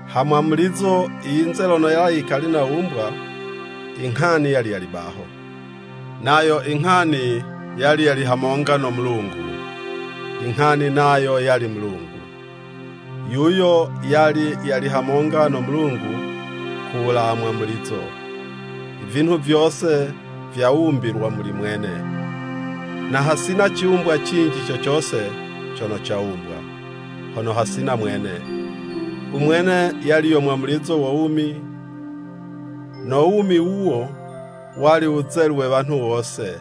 Ha mwamulizo i yinze lono yali yikali nawumbwa, I Nghani yali yali baho. Nayo I Nghani yali yali hamonga no Mulungu, i Nghani nayo yali Mulungu. Yuyo yali yali hamonga no Mulungu ku wulawa mwamulizo. Ivinhu vyose vyawumbilwa muli mwene, na hasina ciwumbwa cinji co cose cono cawumbwa, hono hasina mwene. U Mwene yali yo mwamulizo wo wumi; no wumi wuwo wali wuzelu we wanhu wose.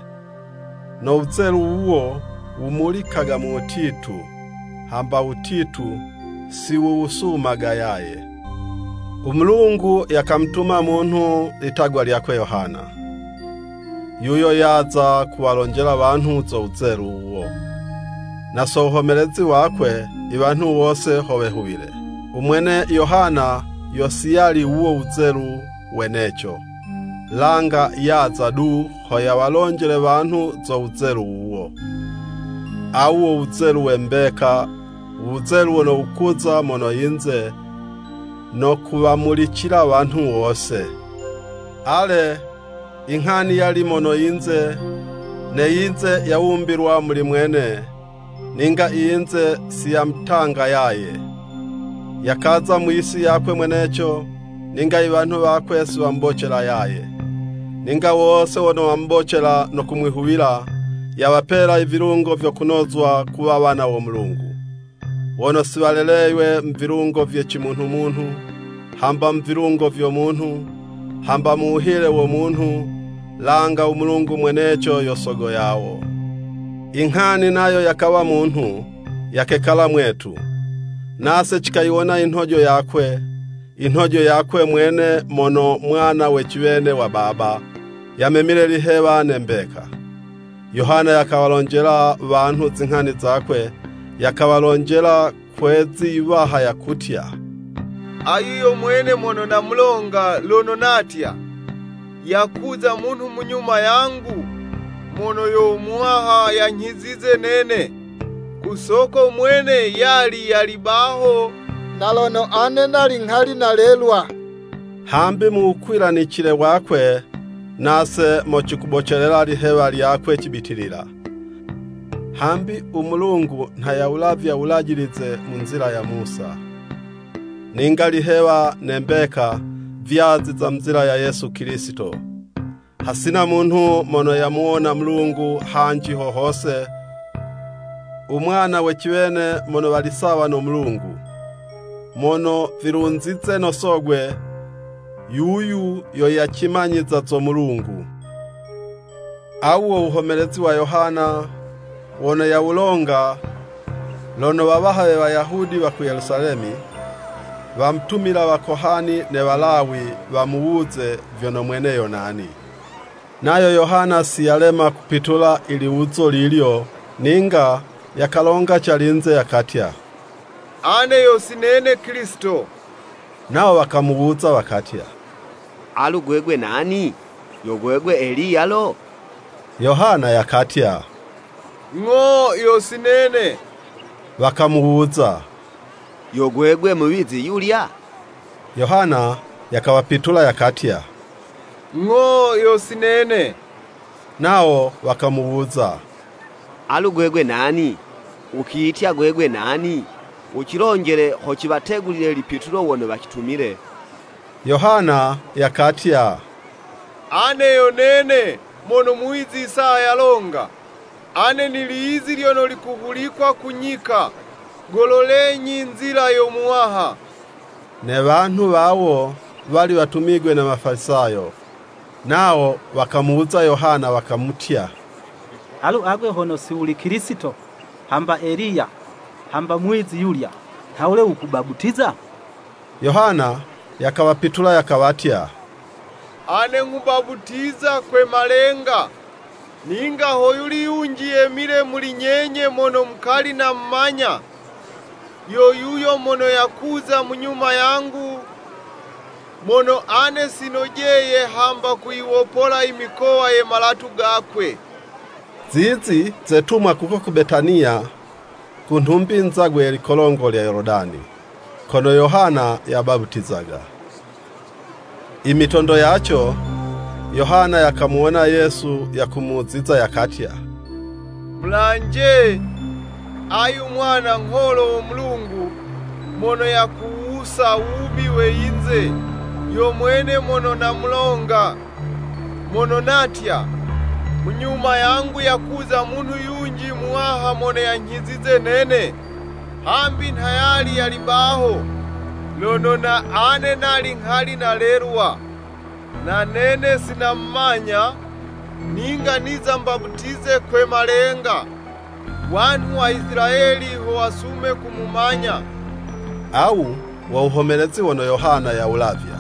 No wuzelu wuwo wumulikaga mu wutitu, hamba wutitu si wuwusumaga yaye. U Mulungu yakamutuma munhu litagwa lyakwe Yohana. Yuyo yaza kuwalonjela wanhu zo wuzelu wuwo. Na so wuhomelezi wakwe, iwanhu wose ho wehuwile. U mwene Yohana, yo si yali wuwo wuzelu weneco, langa yaza du, ho yawalonjele wanhu zo wuzelu wuwo. Awu wo wuzelu we mbeka, u wuzelu wono wukuza mono yinze, no kuwamulicila wanhu wose. Ale, i Nghani yali mono yinze, ne yinze yawumbilwa muli mwene, ninga i yinze si yamutanga yaye. Yakaza mu yisi yakwe mweneco, ninga i wanhu wakwe si wamubocela yaye. Ninga wose wono wamubocela no kumwihuwila, yawapela i vilungo vyo kunozwa kuwa wana wo Mulungu. Wono si waleleywe mu vilungo vye cimunhu munhu, hamba mu vilungo vyo munhu, hamba mu wuhile wo munhu, langa u Mulungu mweneco yo Sogo yawo. I Nghani nayo yakawa munhu, yakekala mwetu. Nase cikayiwona i nhojo yakwe, i nhojo yakwe mwene mono mwana we ciwene wa Baba; yamemile lihewa ne mbeka. Yohana yakawalonjela wanhu zinghani zakwe, yakawalonjela kwe 'zi yiwaha yakutya, “Ayu yo mwene mono namulonga, lono natya, Yakuza munhu munyuma yangu, mono yo muwaha yanyhizize nene, ku soko mwene yali yali baho na lono ane nali nghali nalelwa.” Hambi mu wukwilanicile wakwe, nase mo cikubocelela lihewa lyakwe cibitilila. Hambi u Mulungu, nha yawulavya Wulajilize mu nzila ya Musa, ninga i lihewa ne mbeka, vyaziza mu nzila ya Yesu Kilisito. Hasina munhu mono yamuwona Mulungu hanji ho hose, u Mwana we ciwene mono wali sawa no Mulungu, mono vilunzize no Sogwe, yuyu yo yacimanyiza zo Mulungu. Awu wo wuhomelezi wa Yohana wono yawulonga, lono wawaha we Wayahudi wa ku Yelusalemi, wamutumila wakohani ne Walawi wamuwuze vyono mwene yo nani. Nayo Yohana si yalema kupitula i liwuzo lilyo, ninga yakalonga calinze, yakatya, “Ane yo si nene Kilisito.” Nawo wakamuwuza wakatya, “Alu gwegwe nani? Yo gwegwe Eliya lo?” Yohana yakatya, “Ng'o yo si nene.” Wakamuwuza, “Yo gwegwe muwizi yulya?” Yohana yakawapitula yakatya, “Ng'o yo si nene.” Nawo wakamuwuza “Alu gwegwe nani? Ukiyitya gwegwe nani? Ucilonjele ho ciwategulile lipitulo wono wacitumile.” Yohana yakatya, “Ane yo nene, mono muwizi Isaya yalonga. ‘Ane nili yizi lyono likuhulikwa ku nyika, Gololenyi nzila yo Muwaha.’” Ne wanhu wawo wali watumigwe ne Wafalisayo. Nawo wakamuwuza Yohana wakamutya, “Alu agwe hono si wuli Kilisito, hamba Eliya, hamba muwizi yulya, nhawule wukubaputiza?” Yohana yakawapitula yakawatya, “Ane nghubaputiza kwe malenga, ninga ho yuli yunji yemile muli nyenye mono mukali namumanya. Yo yuyo mono yakuza munyuma yangu, mono ane sinojeye hamba kuyiwopola imikowa ye malatu gakwe.” Zizi zetumwa kuko ku Betaniya, ku nhumbi nzagwe ye likolongo lya Yoludani, kono Yohana yabaputizaga. I mitondo yaco, Yohana yakamuwona Yesu yakumuziza, yakatya, “Mulanje, ayu Mwana Ngholo wo Mulungu, mono yakuwusa, wubi we yinze! Yo mwene mono namulonga, mono natya, ‘Munyuma yangu yakuza munhu yunji muwaha mono yanyhizize nene, hambi nha yali yali baho lono na ane nali nghali nalelwa!’ Na nene si namumanya, ninga niza mbaputize kwe malenga, wanhu wa Isilayeli ho wasume kumumanya.” Awu wo wuhomelezi wono Yohana yawulavya,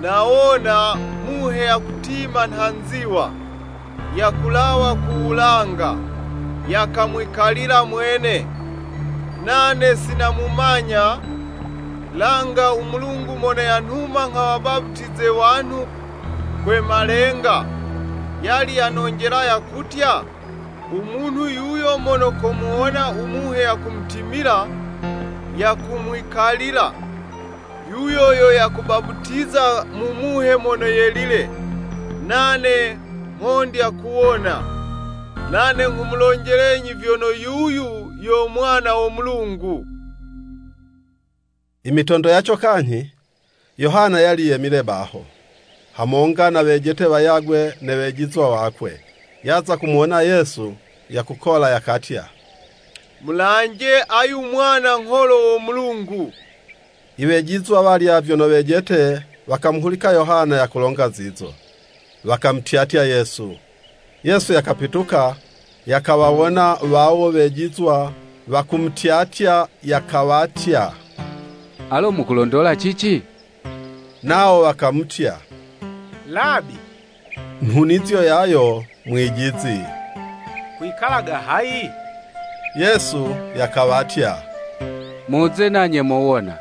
“Nawona Muhe yakutima nha nziwa, yakulawa ku wulanga, yakamwikalila mwene. Nane sinamumanya: langa u Mulungu mono yanhuma nghawabaputize wanhu kwe malenga, yali yanonjela yakutya, ‘U munhu yuyo mono komuwona u Muhe yakumutimila, yakumwikalila, yuyo yo yakubaputiza mu Muhe Mono Yelile.’ Nane nghondya kuwona, nane nghumulonjelenyi vyono yuyu yo Mwana wo Mulungu.” I mitondo yaco kanyhi, Yohana yali yemile baho, hamonga na wejete wayagwe ne wejizwa wakwe. Yaza kumuwona Yesu yakukola, yakatya, “Mulanje ayu Mwana Ngholo wo Mulungu!” I wejizwa walya vyono wejete, wakamuhulika Yohana yakulonga zizo, wakamutyatya Yesu. Yesu yakapituka, yakawawona wawo wejizwa wakumutyatya, yakawatya, “Alo mukulondola cici?” Nawo wakamutya, “Labi (nhunizo yayo Mwijizi) kwikalaga hayi?” Yesu yakawatya, “Muze nanye mowona.”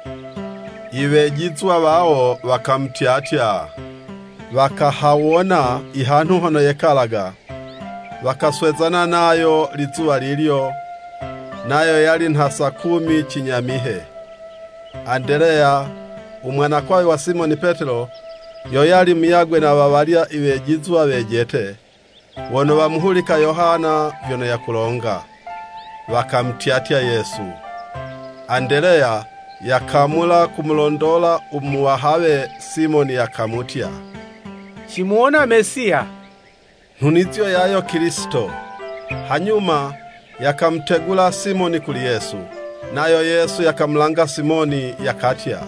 Iwejizwa wawo wakamutyatya, wakahawona i hanhu hono yekalaga. Wakaswezana nayo lizuwa lilyo, nayo yali nha saa kumi cinyamihe. Andeleya, u mwanakwawe wa Simoni Petelo, yo yali muyagwe na wawalya iwejizwa wejete, wono wamuhulika Yohana vyono yakulonga, wakamutyatya Yesu. Andeleya yakamula kumulondola u muwahawe Simoni, yakamutya, “Cimuwona Mesiya” (nhunizo yayo Kilisito.) Hanyuma yakamutegula Simoni kuli Yesu. Nayo Yesu yakamulanga Simoni, yakatya,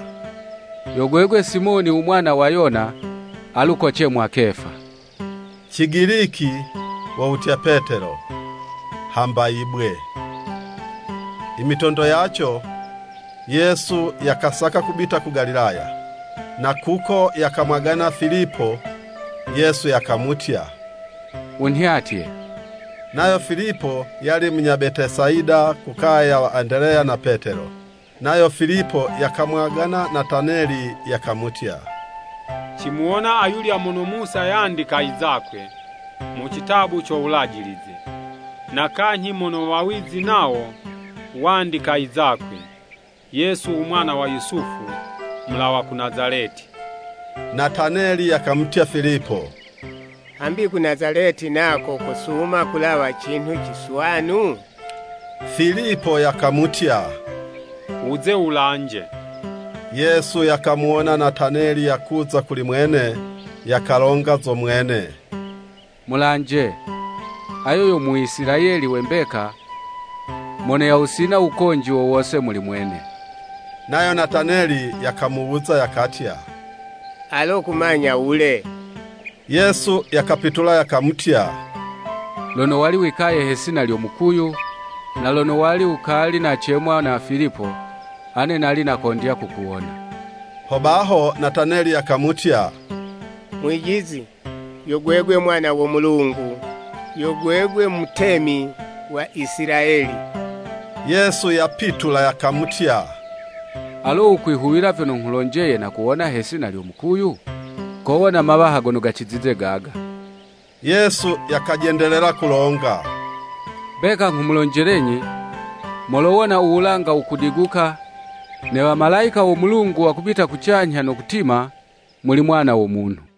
“Yo gwegwe Simoni u mwana wa Yona, alu kocemwa Kefa.” (Cigiliki wo wutya Petelo, hamba, “Yibwe”.) I mitondo yaco, Yesu yakasaka kubita ku Galilaya, na kuko yakamwagana Filipo, Yesu yakamutya, “Wunhyatye.” Nayo Filipo yali munya Betesayida ku kaya ya wa Andeleya na Petelo. Nayo Filipo yakamwagana Nataneli, yakamutya, “Cimuwona ayulya mono Musa yandika i zakwe, mu citabu co Wulajilize, na kanyhi mono wawizi nawo wandika i zakwe, Yesu u mwana wa Yusufu, mulawa ku Nazaleti.” Nataneli yakamutya Filipo, “Hambi ku Nazaleti nako kosuma kulawa cinhu ciswanu?” Filipo yakamutya, “Wuze wulanje.” Yesu yakamuwona Nataneli yakuza kuli mwene, yakalonga zo mwene, “Mulanje! Ayo yo Mwiisilayeli we mbeka, mono yawusina wukonji wo wose muli mwene.” Nayo Nataneli yakamuwuza, yakatya, “Alo kumanya wule?” Yesu yakapitula yakamutya, “Lono wali wikaye he 'sina lyo mukuyu, na lono wali wukali nacemwa na Filipo, ane nali nakondya kukuwona.” Hobaho Nataneli yakamutya, “Mwijizi, yo gwegwe Mwana wo Mulungu, yo gwegwe Mutemi wa Isilayeli.” Yesu yapitula yakamutya, “Alo wukwihuwila vyono nghulonjeye, nakuwona he 'sina lyo mukuyu? Kowona mawaha gono gacizize gaga.” Yesu yakajendelela kulonga, “Mbeka nghumulonjelenyi, molowona u wulanga wukudiguka, ne wamalayika wo Mulungu wakubita kucanyha no kutima, muli Mwana wo Munhu.”